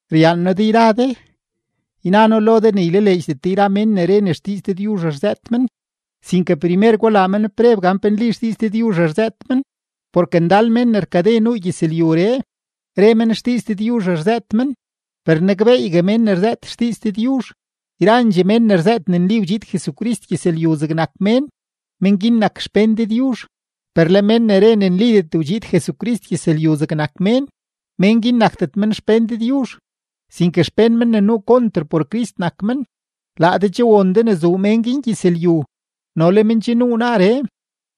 Ryaan noo de yra de; yna noo lo de ne ylaleedxdet de yra mén ne re ne xdiiz Dëdyuzh rzëët men; sinke primer gulaa men preb gan pe nli xdiiz Dëdyuzh rzëët men, porke ndal mén ne rkade nuu gyëzlyuree, re men xdiiz Dëdyuzh rzëët men. Per nakbeeygue mén ne rzëët xdiiz Dëdyuzh: yrandxee mén ne rzëët ne nli wdxiid Jesucrist gyëzlyu zegnak mén, mén guin nak xpén Dëdyuzh. Per le mén ne re ne nlidet wdxiid Jesucrist gyëzlyu zegnak mén, mén guin nakdet men xpén Dëdyuzh, sinke xpén mén ne nuu konter por Crist nak men. Laa de che won de ne zuu mén guin gyëzlyu, no le men che nuu naaree.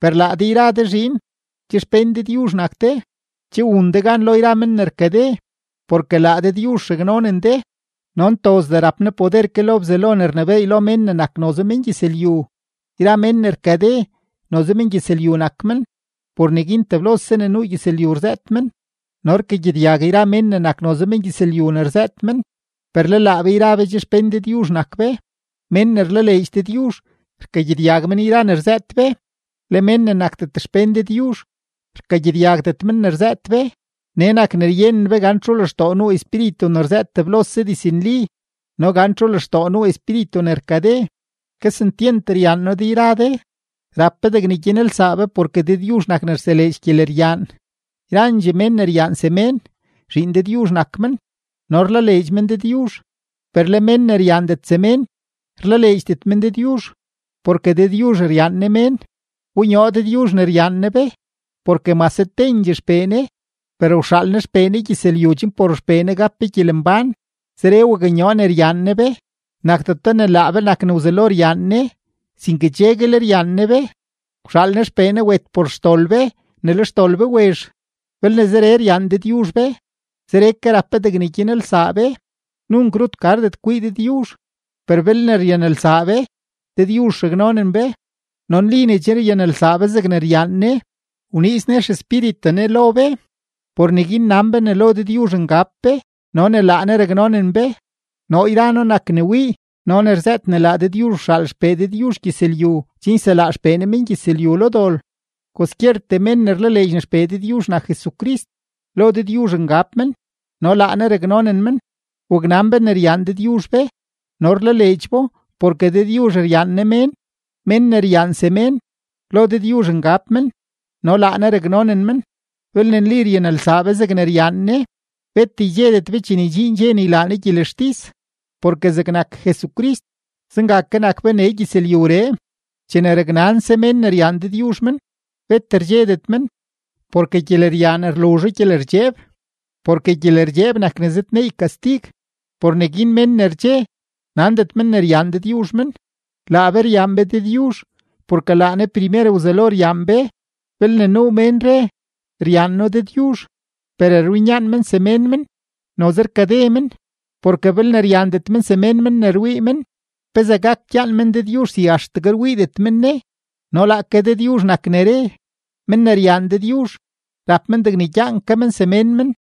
Per laa de yra de zhiin, che xpén Dëdyuzh nak de, che wun de gan lo yra men ne rkade, porke laa Dëdyuzh raknonen de no ntozdee rap Ne poder ke lo Bzelo ne rnebééy lo mén ne nak noze mengyëzlyu. Yra men ne rkade, noze mengyëzlyu nak men; por neguin teblose ne nuu gyëzlyu rzëët men, no rkagyedyag yra mén ne nak noze mengyëzlyu ne rzëët men. Per le laa be yra be che xpén Dëdyuzh nak be. Mén ne rlaleedx Dëdyuzh, rkagyedyag men yra ne rzëët be; le mén ne nakdet xpén Dëdyuzh, rkagyedyagdet men ne rzëët be. Nee nak ne ryenen be gan txu lextoo nuu Espíritu ne rzëët teblose diznli no gan txu lextoo nuu espíritu ne rkade. Kesentyent ryaan noo de yra de; rap be degne gyanelsaa be porke Dëdyuzh nak ne rseleedx gyeleryaan. Yrandxee mén ne ryaan semén, zhiin Dëdyuzh nak men no rlaleedx men Dëdyuzh. Per le mén ne ryaandet semén, rlaleedxdet men Dëdyuzh, porke Dëdyuzh ryaan Ne mén. Wbonyoo Dëdyuzh ne ryaan Ne be, porke mase tendxee XPee Ne, per wxaal Ne XPee Ne gyëzlyu chen por XPee Ne gap be gyelembán. Zeree waknyoo ne ryaan Ne be: nakdeto ne laa be nak ne wzelo ryaan Ne, sinke cheguel ryaan Ne be, wxaal Ne XPee Ne wet por xdol be ne le xdol be wezh. Belne zeree ryaan Dëdyuzh be, zeree ke rap be degne gyanelsaa be. Nunk rut gardet kwii Dëdyuzh; per belne ryanelsaa be, Dëdyuzh raknonen be, no nli ne che ryanelsaa be zegne ryaan Ne. Wniiz Ne XEspíritu Ne lo be; por neguin nan be ne lo Dëdyuzh ngab be no ne laa Ne raknonen be. Noo yra noo nak ne wii no ne rzëët ne laa Dëdyuzh wxaal XPee Dëdyuzh gyëzlyu chen yselaa XPee Ne mengyëzlyu lo dol. Kwaskyertee mén ne rlaleedx ne XPee Dëdyuzh nak Jesucrist, lo Dëdyuzh ngab men no laa Ne raknonen men. Waknan be ne ryaan Dëdyuzh be no rlaleedx bo porke Dëdyuzh ryaan Ne mén. Mén ne ryaan semén, lo Dëdyuzh ngab men no laa Ne raknonen men. Belne nli ryanelsaa be zegne ryaan Ne, bet ydxedet be chene ydxiin dxe ne ylaa Ne gyelextis, porke zegnak Jesucrist, zenga ke nak be nee gyëzlyuree. Chene raknanse mén ne ryaan Dëdyuzh men, bet rdxedet men, porke gyeleryaan rluzho gyelerdxeeb, porke gyelerdxeeb nak ne zëdneey kastig. Por neguin men ne rdxe, nandet men ne ryaan Dëdyuzh men. Laa be ryaan be Dëdyuzh, porke laa Ne primer wzelo ryaan be. Belne nuu mén re: “Ryaan noo Dëdyuzh”, per rwinyaan men semén men, noze rkade men. Porke belne ryaandet men semén men ne rwii men, ¿pezee gak gyaan men Dëdyuzh si axtegue rwiidet men Ne? No laake Dëdyuzh nak ne re: men ne ryaan Dëdyuzh, rap men degne gyaan ke men semén men.